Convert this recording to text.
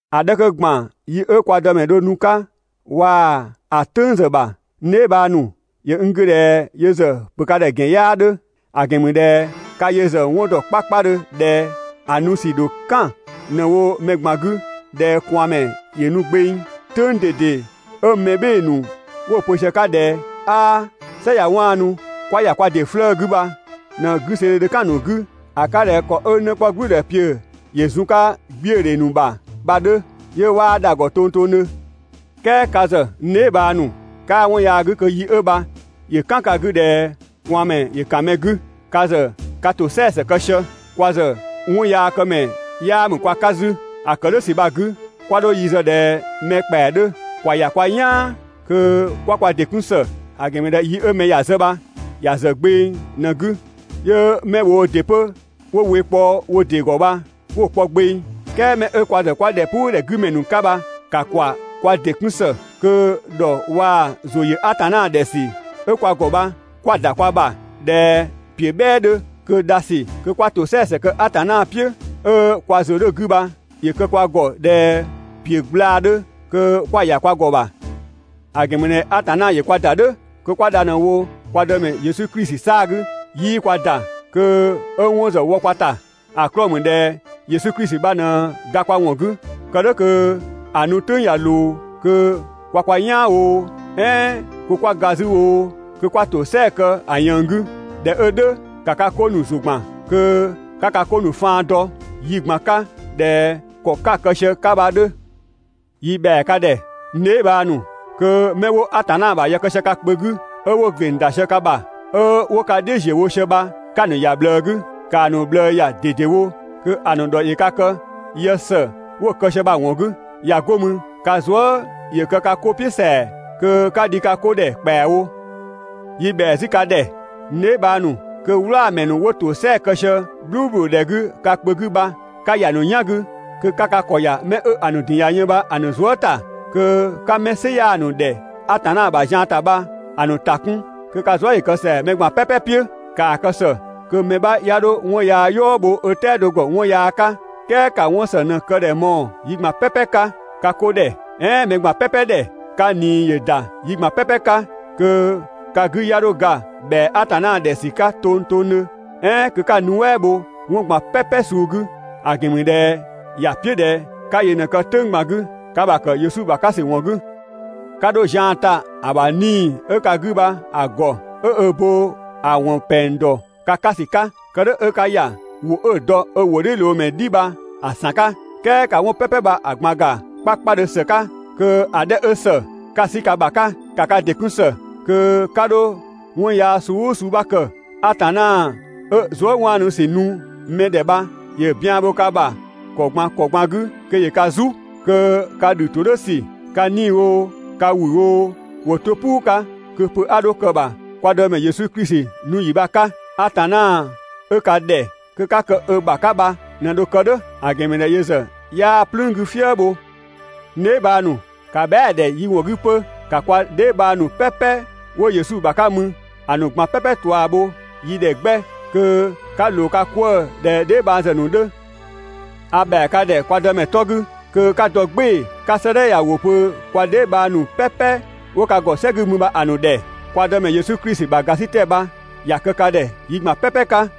‑A 'dhɛ 'kö ‑gban yi 'ö kwa Dëmɛ dho nu‑ 'ka waa‑ ‑a "tʋ̈ng ‑zë ‑bha, n dheebhang ‑nu, ‑yö n 'gü ꞊dhɛ yö ‑zë ‑pö ka ‑dhɛ ‑gɛn ‑zian 'yaa 'dhö. ‑A ‑gɛn ‑mü ꞊dhɛ ka yö ‑zë 'wɔn ‑dɔ 'kpakpadhö ꞊dhɛ ‑a nu ‑sü ‑dho "kan ꞊në‑ wo mɛ ꞊gban 'gü ꞊dhɛ ꞊kwaanmɛ ‑yö nu gbeng. "Tʋ̈ng ꞊dede 'ö mɛ "bhɩɩ‑ ‑nu 'wo‑ pö sië‑ 'ka ꞊dhɛ: «'Aa "sɛ ꞊ya 'waanu, 'kwa ‑ya kwa ‑dɩ 'flëë‑ 'gü bha ꞊në 'güseedhe dho "kan‑ ‑nu 'gü ‑a 'ka ꞊dhɛ ‑kɔ 'ö 'në 'kpɔ "gblʋ̈ʋ̈dhɛpiʋ̈ ‑yö zun‑ 'ka 'gbiödhe ‑nu ‑bha bha‑ 'dhö, 'yö 'waa dha‑ ‑gɔ tongtongdhö. "Kɛɛ ka ‑zë, n dheebhang ‑nu, 'kaa 'wɔn yaa 'gü kö yi 'ö bha ‑yö "kan ka 'gü ꞊dhɛ ꞊kwaanmɛ ‑yö ‑kan mɛ 'gü. Ka ‑zë ka ‑tosɛa ‑së kë sië, kwa ‑zë 'wɔnyaakëmɛ 'yaa ‑mü kwa 'ka 'zü. ‑A ‑kë "dhʋ̈ ‑sü bha‑ 'gü, 'kwa 'dho yi zë ꞊dhɛ mɛ ‑kpɛa 'dhö, ‑kwa ‑ya kwa "yaan kö 'kwa kwa ‑dɩ 'kun ‑së. ‑A ‑gɛn ‑mü ꞊dhɛ yi 'ö mɛ ‑ya zë bha ‑ya ‑zë gbeng ꞊në‑ 'gü, 'yö 'mɛ woo ‑dɩ 'pö 'wo we kpɔ wo ‑dɩ ‑gɔ bha 'wo‑ kpɔ gbeng. "Kɛɛ mɛ 'ö kwa ‑zë 'kwa ‑dhɛpuudhɛ 'gü ‑mɛ ‑nu 'ka bha, ‑ka ‑kwa kwa ‑dɩ 'kun ‑së, kö ‑dhɔ waa‑ ‑zʋ ‑yö Atanna ‑dhɛ ‑sü 'ö kwa ‑gɔ bha, 'kwa‑ ‑da kwa ‑bha ꞊dhɛ ‑piö "bhɛɛ 'dhö, kö dha ‑sü kö 'kwa ‑tosɛa ‑së kë Atanna "piʋ̈, 'ö kwa ‑zʋ 'dhö‑ 'gü bha ‑yö kë kwa ‑gɔ ꞊dhɛ ‑piö gblaa‑ 'dhö kö 'kwa‑ ‑ya kwa ‑gɔ ‑bha. ‑A ‑gɛn ‑mü ꞊dhɛ Atanna ‑yö kwa ‑da "dhʋ̈ kö 'kwa dha ꞊në wo kwa Dëmɛ Yesu Klisi 'saa‑ 'gü. 'Yii kwa ‑da kö 'ö 'wɔn ‑zë wɔ kwa ‑ta. ‑A 'klɔɔ‑ ‑mü ꞊dhɛ Yesu Klisi bha ꞊në ga kwa ‑wɔn 'gü, kë "dhʋ̈ kö ‑a nu "tʋ̈ng ꞊ya ꞊loo kö kwa kwa "yaan oo, "ɛɛn kö 'kwa ga 'zü oo, kö 'kwa ‑tosɛa kë ‑a ꞊yënng 'gü. ꞊Dhɛ 'ö "dhʋ̈, ‑ka ka 'ko ‑nu ‑zʋ ‑gban, kö 'ka ka 'ko ‑nu faan dɔ yi ꞊gban 'ka ꞊dhɛ ‑kɔ 'ka‑ kë sië‑ 'ka bha‑ 'dhö. Yi ‑bhɛa ka ‑dhɛ, n dheebhang ‑nu, kö 'mɛ 'wo Atanna ‑bha yë kë sië ka kpö 'gü, 'ö 'wo‑ ‑gleng ‑da sië ka ‑bha, 'ö 'wo ka "dhiʋ̈ ‑ziö wo sië bha 'ka‑ ‑nu ‑ya ꞊bhlëë 'gü, ‑kaa ‑nu ꞊bhlëë ‑ya ꞊dedewo kö‑ ‑nu ‑dhɔ ‑yö ka kë yë ‑së 'wo‑ kë sië bha‑ ‑wɔn 'gü. ꞊Ya 'go mü, (ka zuë" ‑yö kë ka 'ko "piʋ̈ ‑sɛa,) kö 'ka dhi ka 'ko ‑dhɛ ‑kpɛawo. Yi ‑bhɛa 'zü ka ‑dhɛ, n dheebhang ‑nu, kö "wlaamɛ ‑nu 'wo ‑tosɛa kë sië "bhluubhludhɛ 'gü ka kpö 'gü bha 'ka ‑ya ‑nu "yan 'gü kö 'ka ka ‑kɔ ‑ya 'mɛ 'ö‑ ‑nu ‑din ꞊ya yën bha‑ ‑nu zuë" ‑ta. Kö 'ka 'mɛ "sɩ 'yaa‑ ‑nu ‑dhɛ Atanna ‑bha zian ‑ta bha‑ ‑nu ‑ta 'kun, kö ka zuë" ‑yö kë ‑sɛa mɛ ꞊gban "pɛpɛ "piʋ̈. ‑Kaa kë ‑së kö mɛ 'bha 'ya 'dho 'wɔn yaa "yɔɔ bho 'ö "tɛado ‑gɔ 'wɔn yaa 'ka, "kɛɛ ‑ka 'wɔn ‑së ꞊në‑ kë ‑dhɛ mɔɔ‑ yi ꞊gban "pɛpɛ 'ka ka 'ko ‑dhɛ, "ɛɛn mɛ ꞊gban "pɛpɛ ‑dhɛ. Ka ꞊nii ‑yö ‑da yi ꞊gban "pɛpɛ 'ka. Kö ka 'gü 'ya 'dho ga ‑bhɛa Atanna ‑dhɛ ‑sü 'ka tongtongdhö, "ɛɛn kö 'ka‑ nuɛ" bho 'wɔn ꞊gban "pɛpɛ suu 'gü, ‑a ‑gɛn ‑mü ꞊dhɛ ‑ya "piʋ̈ ꞊dhɛ 'ka yö ꞊në‑ kë "tʋ̈ng ꞊gban 'gü ka ‑bha ‑kë Yesu Klisi ‑bha 'ka ‑sü ‑wɔn 'gü! 'Ka 'dho zian ta ‑a ‑bha 'Nii‑ 'ö ka 'gü bha‑ ‑gɔ 'ö ö bo ‑a ‑wɔn ‑pɛng ‑dɔ ka 'ka ‑sü 'ka. Kë "dhʋ̈ 'ö 'ka ‑ya ‑wʋ 'ö‑ dɔ ö ‑wʋdhiʋ̈loomɛ "dhi bha‑ ‑san 'ka! "Kɛɛ ‑ka 'wɔn "pɛpɛ bha‑ ꞊gban ‑ga 'kpakpadhö ‑së 'ka, kö‑ 'dhɛ 'ö ‑së, 'ka‑ 'sü ka ‑bha 'ka. ‑Ka ka ‑dɩ 'kun ‑së kö 'ka 'dho 'wɔn yaa suu "ʋʋ suu 'bha kë. Atanna 'ö zuëwaanusü nu mɛ ‑dhɛ bha ‑yö bian bho ka ‑bha ‑kɔ ꞊gban ‑kɔ ꞊gban 'gü kö ‑yö ka "zu, kö ka ‑dhü ‑to "dhʋ̈ ‑sü, ka 'nii‑ oo, ka ‑wü oo, ‑wo 'to "puu 'ka kö pö 'a 'dho kë‑ ‑bha kwa Dëmɛ Yesu Klisi nu ‑yi bha‑ 'ka! Atanna 'ö ka ‑dhɛ kö 'ka kë ö ‑bha 'ka bha ꞊në dho‑ kë "dhʋ̈, ‑a ‑gɛn ‑mü ꞊dhɛ yö ‑zë 'yaa "plüün 'gü "fië bho. N dheebhang ‑nu, ‑ka bhɛa"‑ ‑dhɛ yi ‑wɔn 'gü 'pö. ‑Ka kwa dheebhang ‑nu "pɛpɛ 'wo Yesu ‑bha 'ka mü, ‑a ‑nu ꞊gban "pɛpɛ ꞊tua bho yi ‑dhɛ 'gbɛ, kö 'ka ꞊loo ka 'kwëë‑ ꞊dhɛ dheebhang ‑zë ‑nu 'dhö. A ‑bhɛa ka ‑dhɛ kwa Dëmɛ 'tɔ 'gü kö 'ka dɔ "gbɩɩ‑ 'ka 'sëëdhɛ ya‑ ‑wʋ pö kwa dheebhang ‑nu "pɛpɛ 'wo ka ‑gɔ "sɛ 'gü mü bha‑ ‑nu ‑dhɛ. Kwa Dëmɛ Yesu Klisi ‑bha ‑gasitɛ bha ‑ya kë ka ‑dhɛ (yi ꞊gban "pɛpɛ 'ka)!